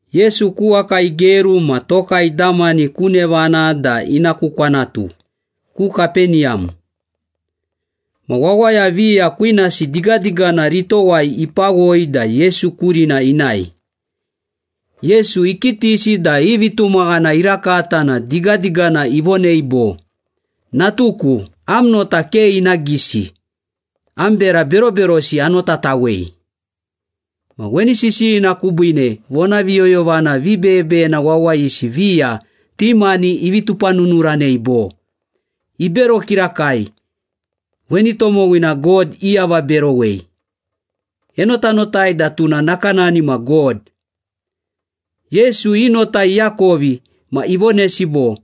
Yesu ku waka igeru ma toka idamani ku nevana da ina ku kwanatu, ku Kapeniyam. Ma wawaya viya kwinasi digadigana ritowai ipawoi da Yesu kurina inae. Yesu ikitisi da i vitumaghana irakata na digadigana ivonei bo, “Natuku, am nota ke ina gisi. Am bera beroberosi anotatawei.” Ma weni sisiyina kubiine vonaviyoyovana vibeyebeyena wawayisi viya ti mani ivi tupanunuranei bo, “Ibero kirakai, weni tomowina God iavaberowei. Enotanotai da tuna nakanani ma God.” Yesu i nota iakovi ma ivonesi bo,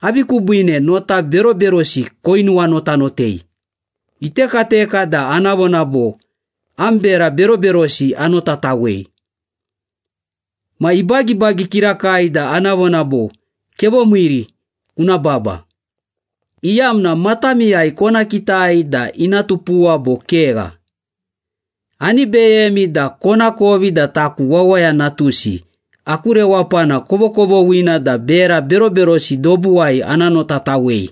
“Avi kubiine nota beroberosi koinuwanotanotei? Itekateka da ana vona bo, ‘Am bera beroberosi anotatawei.’ Ma ibagibagi kirakai da ana vona bo, ‘Kevomiiri, kuna baba,’ iyamna matamiyai kona kitai da ina tupuwa bo kegha. Ani beyemi da konakovi da taku Wawaya Natusi, aku rewapana kovokovoghina da bera beroberosi dobuwai ana notatawei.”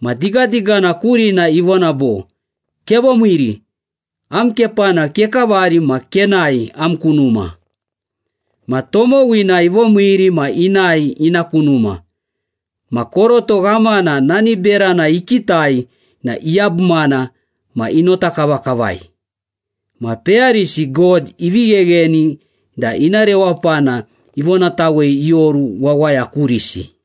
Ma digadigana kurina ivona bo, “Kevomiiri, am kepana kekavari ma kenae am ku numa.” Ma tomowina ivomiiri ma inae ina ku numa. Ma koroto ghamana nani berana ikitai na iyabumana ma inota kavakavai. Ma peyarisi God ivi ghegheni da ina rewapana ivonatawei ioru wawaya kurisi.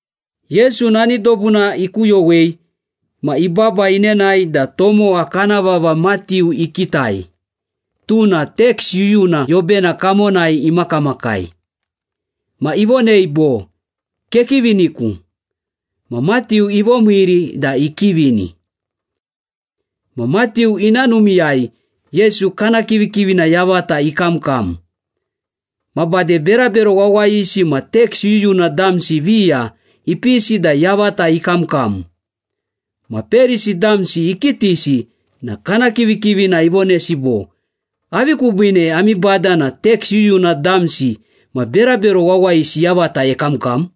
Yesu nani dobuna ikuyowei ma ibaba inenae da tomowa kana vava Matiu ikitai, tuna teks yuyuna yobena kamonai imakamakai. Ma ivonei bo, “Kekiviniku.” Ma Matiu ivomiiri da ikivini. Ma Matiu ina numiiyai, Yesu kana kivikivina yavata ikamkam. Ma bade berabero wawayisi ma teks yuyuna damsi viya ipisi da yavata ikamkam. Ma Perisi damsi ikitisi na kana kivikivina ivonesi bo, “Avi kubiine ami bada na teks yuyuna damsi ma berabero wawayisi yavata ekamkam?”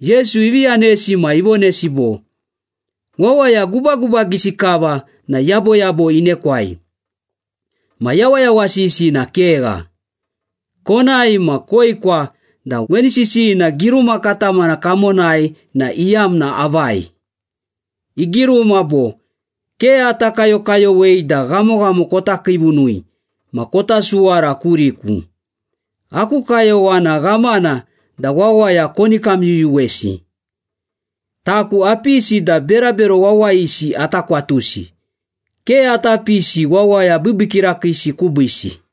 Yesu ivi yanesi ma ivonesi bo, “Wawaya gubagubagisi kava na yaboyabo inekwai, ma yawayawasisi na kegha. Konae ma koekwa da weni sisiyina giruma katamana kamonai na iyamna avai. Igiruma bo, ‘Ke ata kayokayowei da ghamoghamo kota kiivunui ma kota suwara kuriku. Aku kayowana ghamana da wawaya koni kamyuyuwesi.’ Taku apisi da berabero wawayisi ata kwatusi. Ke ata pisi wawaya biibii kirakiisi kubiisi.”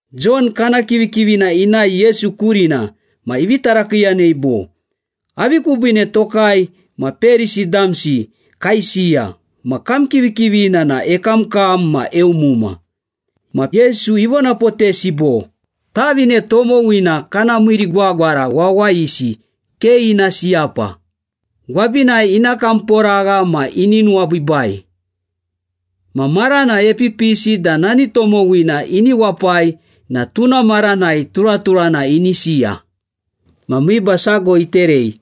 Jon kana kivikivina inae Yesu kurina ma ivi tarakiiyanei bo, “Avi kubiine tokai ma Perisi damsi kaisiya, ma kam kivikivina na ekamkam ma eumuma.” Ma Yesu ivonapotesi bo, “Tavine tomowina kana miimiirigwagwara wawayisi ke ina siyapa, gwabinai ina kamporagha ma ini nuwabiibai. Ma marana epipisi da nani tomowina ini wapai ma tuna maranai turaturana ini siya.” Ma miiba sago iterei.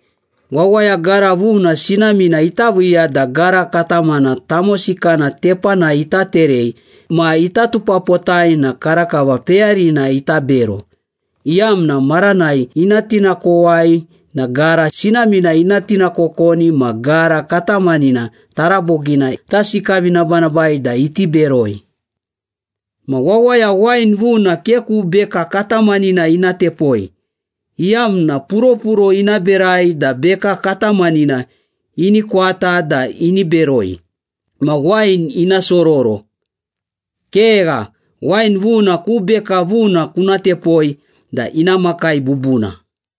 “Wawaya gara vuna sinamina ita viiya da gara katamana tamosikana tepanai ita terei ma ita tupapotai na karakava peyarina ita bero, iyamna maranai ina tinakowai na gara sinamina ina tinakokoni ma gara katamanina tarabogina ita sikavinabanabai da iti beroi. Ma wawaya wain vuna ke ku beka katamanina ina tepoi, iyamna puropuro ina berai da beka katamanina ini kwata da ini beroi ma wain ina sororo. Kegha, wain vuna ku beka vuna kuna tepoi da ina makai bubuna.”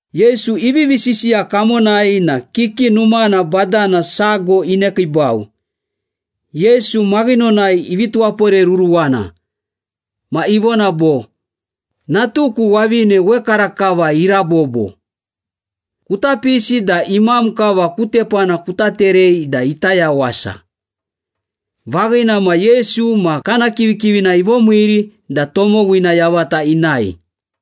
Yesu ivivi sisiya kamonai na kiki numana badana sago inekiibau. Yesu maghinonai ivi tuwaporeruruwana ma ivona bo, “Natuku wavine wekarakava irabobo. Kuta pisi da imam kava ku tepana kuta terei da ita yawasa.” Vaghina ma, Yesu ma kana kivikivina ivomiiri da tomowina yavata inae.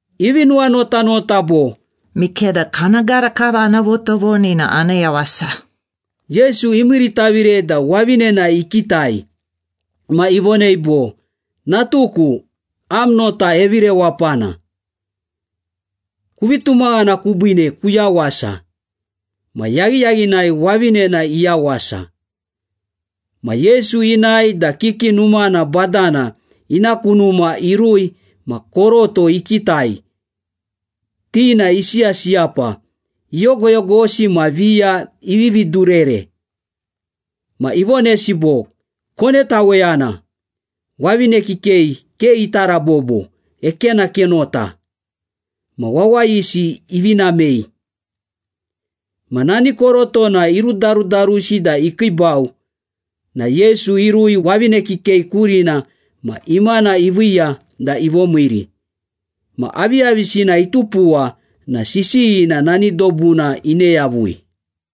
Ivi nuwanotanota bo, “Mikeda kana gara kava ana votovoni na ana yawasa.” Yesu imiiritavire da wavinena ikitai. Ma ivonei bo, “Natuku, am nota evirewapana. Kuvi tumaghana kubiine kuyawasa.” Ma yaghiyaghinai wavinena iyawasa. Ma Yesu inae da kiki numana badana ina ku numa irui ma koroto ikitai, ti na isiyasiyapa, iyogoyogosi ma viya ivivi durere. Ma ivonesi bo, “Konetaweyana. Wavine kikei ke ita rabobo, ekenakenota.” Ma wawayisi ivi namei. Ma nani korotona irudarudarusi da ikiibau na Yesu irui wavine kikei kurina ma imana iviiya da ivomiiri. Ma aviyavisina itupuwa na sisiyina nani dobuna ine yavui.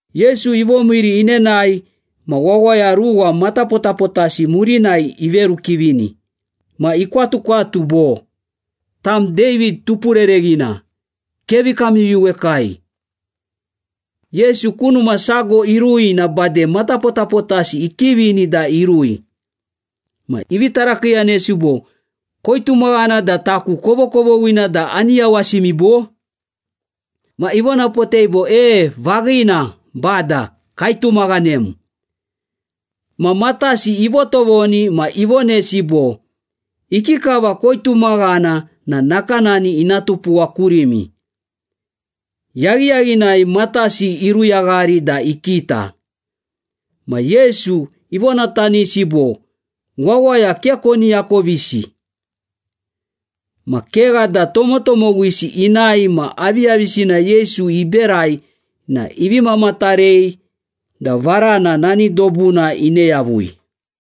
Yesu ivomiiri inenae ma wawaya ruwa matapotapotasi murinai iverukivini, ma ikwatukwatu bo, “Tam David Tupurereghina, kevi kamyuyuwekai.” Yesu ku numa sago irui na bade matapotapotasi ikivini da irui. Ma ivi tarakiiyanesi bo, “Koitumaghana da taku kovokovoghina da ani yawasimi, bo?” Ma ivonapotei bo, “E, vaghina, Bada, kaitumaghanem.” Ma matasi ivotovoni ma ivonesi bo, “Ikikava koitumaghana na nakanani ina tupuwa kurimi.” Yaghiyaghinai matasi iruyaghari da ikita. Ma Yesu ivonatanisi bo, “Wawaya ke koni akovisi.” Ma kegha da tomotomowisi inae ma aviyavisina Yesu iberai na ivi mamatarei da varana nani dobuna ine yavui.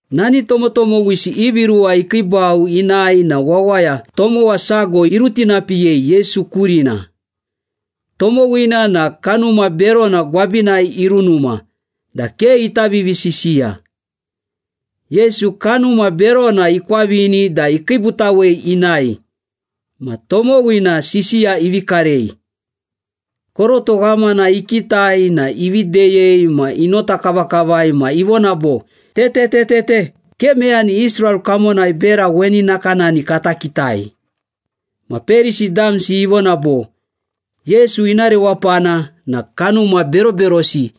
Nani tomotomowisi ivi ruwa ikiibau inae na wawaya tomowa sago irutinapiyei Yesu kurina. Tomowina na kanuma berona gwabinai irunuma da ke ita vivisisiya. Yesu kanuma berona ikwavini da ikiibutawei inae, ma tomowina sisiya ivi karei. Koroto ghamana ikitai na ivi deyei ma inota kavakavai ma ivona bo, “Te, te, te, te, te! Ke meyani Israel kamonai bera weni nakanani kata kitai!” Ma Perisi damsi ivona bo, “Yesu ina rewapana na kanuma beroberosi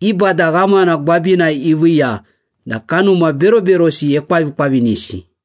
i bada ghamana gwabinai iviiya da kanuma beroberosi ekwavikwavinisi.”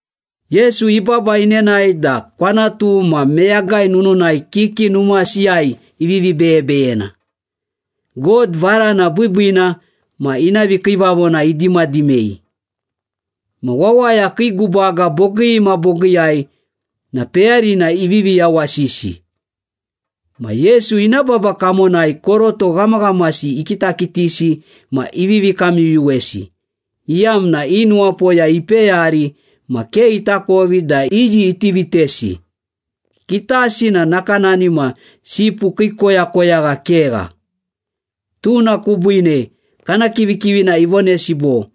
Yesu ibaba inenae da kwanatu ma meyagai nununai, kiki numasiyai ivivi beyebeyena, God varana biibiina ma ina vikiivavona idimadimei. Ma wawaya kii gubaga bogii ma bogiiyai na peyarina ivivi yawasisi. Ma Yesu ina baba kamonai koroto ghamaghamasi ikitakitisi ma ivivi kamyuyuwesi, iyamna i nuwapoya ipeyari ma ke itakovi da iyi iti vitesi. Kitasi na nakanani ma sipu kii koyakoyagha kegha. Tuna kubiine kana kivikivina ivonesi bo,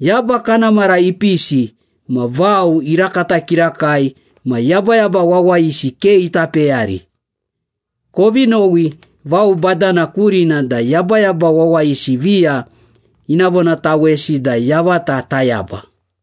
“Yaba kana mara ipisi ma vao irakata kirakai ma yabayaba wawayisi ke ita peyari. Kovi nowi vao badana kurina da yabayaba wawayisi viya ina vonatawesi da yavata tayaba.”